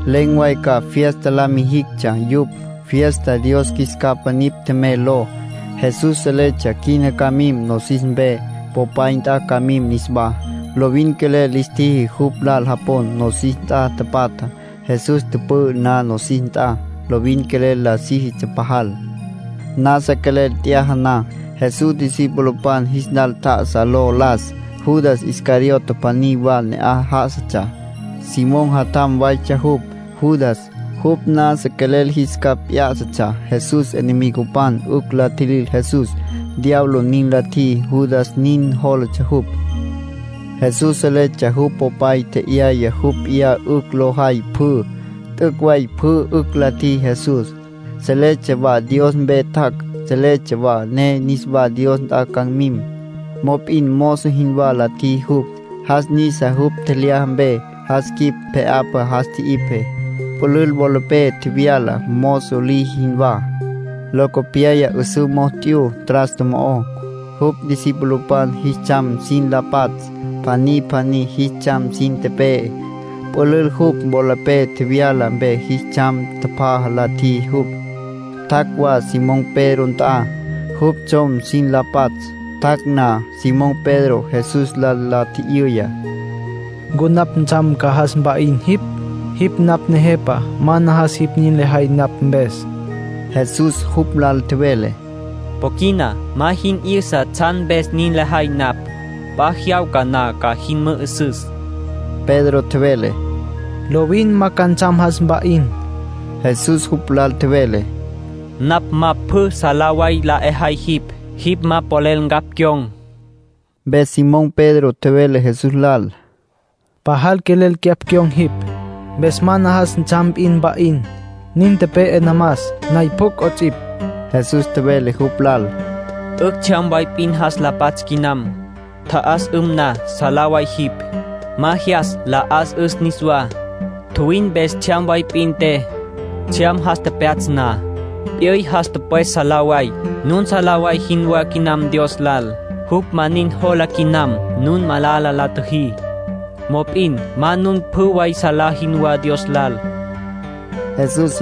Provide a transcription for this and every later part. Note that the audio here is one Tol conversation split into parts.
Len̈ way ca fiesta la mijictsja yupj, fiesta “Dios Qjuis Capa Nipj Tjemey” ló. Jesús seletsja quina ca mim nosis mpe, Popay nt'a ca mim niswá. Lovin quelel lis tjiji jupj lal japon, nosis nt'a tapatjá. Jesús tüpü'ü na nosis nt'a, lovin quelel la síjitsja pajal. Nasa quelel t'yaja na, Jesús discipulopan jis lal tjá'asa lo las. Judas Iscariote pjaní wa ne'aj já'asatsja. Simón jatjam waytsja jupj, Judas. Jupj nasa quelel jis capj p'yá'satsja Jesús enemigopan 'ücj la tjilil Jesús. Diablo nin la tjiji Judas nin jólatsja jupj. Jesús seletsja jupj Popay tje'yaya jupj p'iyá 'ücj lo jay pjü. T'üc' way pjü 'ücj la tjiji Jesús. Seletsja wa Dios mpe tjac', seletsja wa ne niswa Dios nt'a ca mim. Mop'in mozo jinwá la tjiji jupj. Jas nisa jupj tjelyaja mpe, jas quip pje'apa jas tji'ipje. Pülül wolapé tjevyala, mozo liji jinwá. Locopyaya 'üsǘ mo'o t'yu trasto mo'ó, jupj discipulopan jis tsjam sin la patsj. Pjaní pjaní jis tsjam sin tepe'e. Pülül jupj wolapé tjevyala mpe jis tsjam tjapjaja la tjiji jupj. Tjac' wa Simón Pedro nt'a, jupj tsjom sin la patsj. Tjac' na, Simón Pedro Jesús lal la tji'yüya: —¿Ncu napj ntsjam ca jas mpa'in jipj? Jipj napj Nejepa. Ma najas jipj nin lejay napj mpes. Jesús jupj lal tjevele: —Po quina ma jin 'yüsa tsjan mpes nin lejay napj. P'a jyawca na ca jin mü'üsüs. Pedro tjevele: —Lovin ma ca ntsjam jas mpa'in. Jesús jupj lal tjevele: —Napj ma pjü salá way la 'ejay jipj, jipj ma polel ncapj cyon̈. Mpes Simón Pedro tjevele Jesús lal: —Pajal quelel cyapj cyon̈ jipj. Mpes ma najas ntsjam p'in mpa'in. Nin tepe'e namas, nay pjucj 'ots'ipj. Jesús tjevele jupj lal: —'Ücj tsjyam way p'in jas la patsj quinam. Tja'as'üm na, salá way jipj. Ma jyas la 'as'üs niswá. Tjuwin mpes tsjyam way p'in te. Tsjyam jas tepyatsj na, p'yüy jas tüpwes salá way. Nun salá way jinwá quinam Dios lal. Jupj ma nin jola quinam nun malala la tjüjí. Mop'in ma nun pjü way salá jinwá Dios lal —nin tjevele Jesús.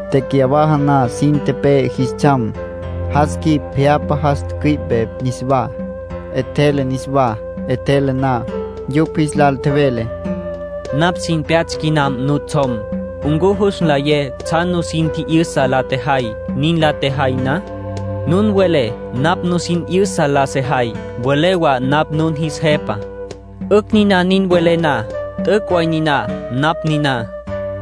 Tecyawaja na sin tepe'e jis tsjam, jas quip pje'apa jas tücüi'pe niswá, 'etjele niswá. 'Etjele na, yupj jis lal tjevele: —Napj sin tepyatsj quinam nutsjom. ¿Ncu jus nlayé tsjan nusin tji'yüsa la tjejay nin la tjejay na? Nun welé napj nusin 'yüsa la sejay, welé wa napj nun jis Jepa. 'Ücj niná nin welé na. T'üc' way niná napj niná.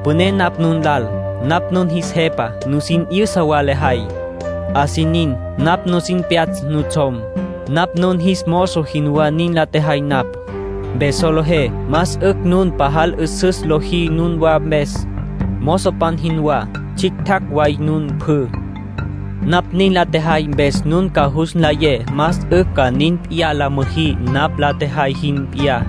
Püné napj nun lal. Napj nun jis Jepa, nusin 'yüsa wa lejay; así nin napj nusin tepyatsj nutsjom. Napj nun jis mozo jinwá nin la tjejay napj. Mpes solejé más 'ücj nun pajal 'üsüs lojí nunwa mpes, mozopan jinwá. Tsjictjacj way nun pjü. Napj nin la tjejay mpes nun ca jus nlayé más 'ücj ca nin p'iyá la müjí napj la tjejay jin p'iyá.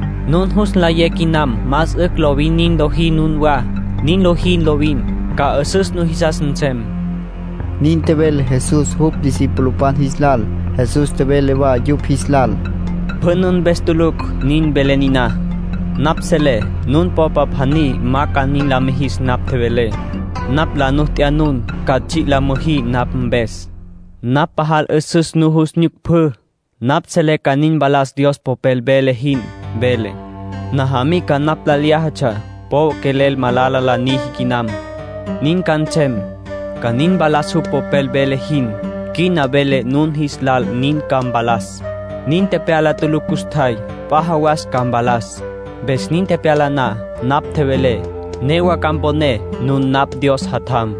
Nun jus nlayé quinam más 'ücj lovin nin lojí nunwá. Nin lojí lovin, ca 'üsüs nujisas nsem —nin tjevele Jesús jupj discipulopan jis lal. Jesús tjevele wa yupj jis lal: —Pjü nun mpes tulucj nin velé niná. Napj selé nun popa pjaní ma ca nin la mijis napj tjevelé. Napj la nu t'ya nun ca tsji' la müjí napj mpes. Napj pajal 'üsüs nujus nyuc pjü. Napj selé ca nin mpalas Dios Popel vele jin. Vele: ‘Najamica napj lal lyájatsja, po quelel malala la niji quinam’. Nin ca nsem, ca nin mpalas jupj Popel vele jin. Quina velé nun jis lal nin ca mpalas. Nin tepyala tulucj custjay. P'a jawas ca mpalas. Mpes nin tepyala na napj tjevelé, newa ca mponé nun napj Dios Jatjam.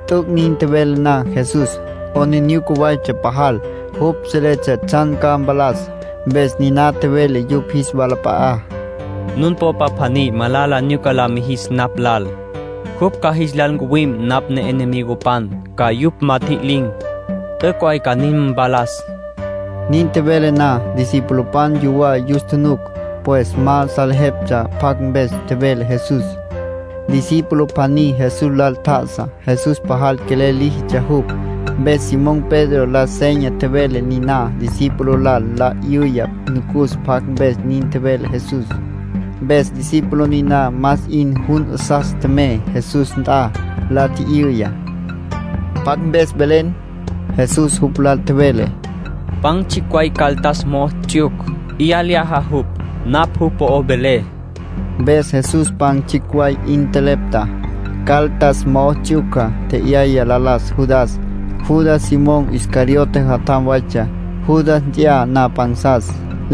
T'üc' nin tjevele na Jesús, 'aplijila waytsja pajal. Jupj seletsja tsjan ca mpalas, mpes niná tjevele yupj jis walap'a'á: —Nun popa pjaní malala nyuca la mijis napj lal. Jupj ca jis lal ncuwim napj enemigopan, ca yupj ma tjililin̈. T'üc' way ca nin mpalas. Nin tjevele na, discipulopan yuwá yus tjunuc. Pues ma salejeptsja pjacj mpes tjevele Jesús. Discípulo pjaní Jesús lal tjá'asa. Jesús pajal quelel líjitsja jupj. Mpes Simón Pedro la seña tjevele niná discípulo lal la 'yüya nucus pjacj mpes nin tjevele Jesús. Mpes discípulo niná más 'in jun 'asas tjemey Jesús nt'a, la tji'yüya: —¿Pjacj mpes velen? Jesús jupj lal tjevele: —Pan tsjicj way caldas mo'o ts'yuc, 'ya lyaja jupj; napj jupj po'ó velé. Mpes Jesús pan tsjicj way 'in tjelepta, caldas mo'o ts'yuca, tje'yaya nlajas Judas. Judas Simón Iscariote jatjam waytsja. Judas nt'ya na pansas,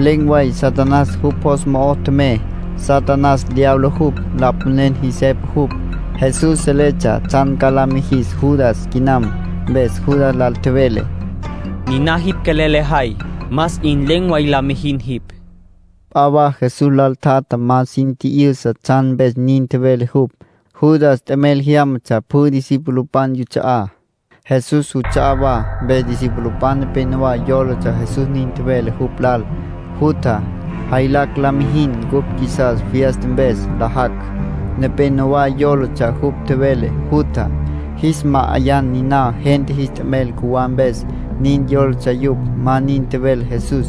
len̈ way Satanás jupj jos mo'o tjemey. (Satanás diablo jupj. Lapanen jis jepa jupj.) Jesús seletsja tsjan ca la mijis Judas quinam, mpes Judas lal tjevele: —Niná jipj quelel lejay, más 'in len̈ way la mijin jipj. P'a wa Jesús lal tjatjá ma sin tji'yüsa tsjan mpes nin tjevele jupj. Judas t'emel jyámatsja pjü discipulopan yuts'a'á, Jesús juts'a'á wa. Mpes discipulopan nepénowa yólatsja Jesús nin tjevele jupj lal: “Jutja, jaylacj la mijin cupj qjuisas fiesta mpes nlajacj”. Nepénowa yólatsja jupj tjevele: “Jutja, jis ma'ayan niná gente jis t'emel cjuwá mpes”. Nin yólatsja yupj. Ma nin tjevele Jesús.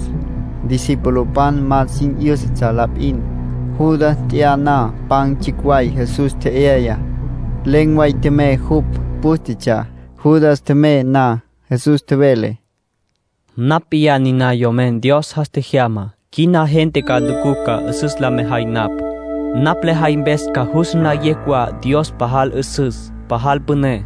Discipulopan ma sin 'yǘsatsja la p'in. Judas nt'ya na pan tsjicj way Jesús tje'yayá, len̈ way tjemey jupj. Pǘstetsja. Judas tjemey na, Jesús tjevele: —Napj p'iyá niná Yomen Dios jas tjejyamá. Quina gente ca nucucj ca 'üsüs la mejay napj. Napj lejay mpes ca jus nlayecj wa Dios pajal 'üsüs, pajal püné.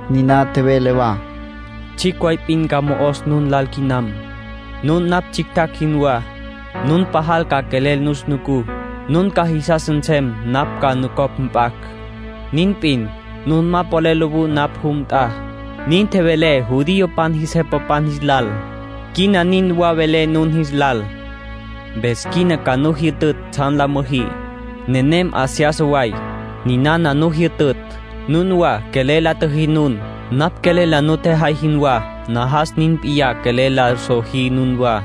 Niná tjevele wa: —Tsjicj way p'in ca mo'os nun lal quinam, nun napj tsjictjacj jinwá. Nun pajal ca quelel nus nucú. Nun ca jisas nsem napj ca nucopj mp'acj. Nin p'in, nun ma polel lowú napj jum nt'a. Nin tjevelé judiopan jis jepapan jis lal; quina nin wa velé nun jis lal. Mpes quina ca nu jyütütj tsjan la müjí, nenem 'a seyasa way. Ninana nu jyütütj: nunwa quelel la tjüjí nun. Napj quelel la nutjejay jinwá, najas nin p'iyá quelel la sojí nunwá.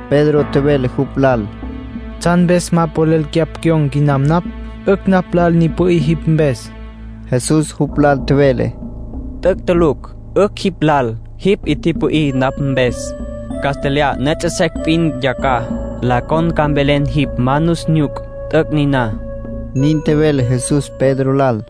Pedro tjevele jupj lal: —¿Tsjan mpes ma polel cyapj cyon̈ quinam napj? 'Ücj napj lal ni pü'í jipj mpes. Jesús jupj lal tjevele: —T'üc' tulucj 'ücj jipj lal jipj 'i pü'í napj mpes. Castlyaj la puyú secj p'in yacjaj, la con ca mvelen jipj ma nus nyuc. T'üc' niná —nin tjevele Jesús Pedro lal.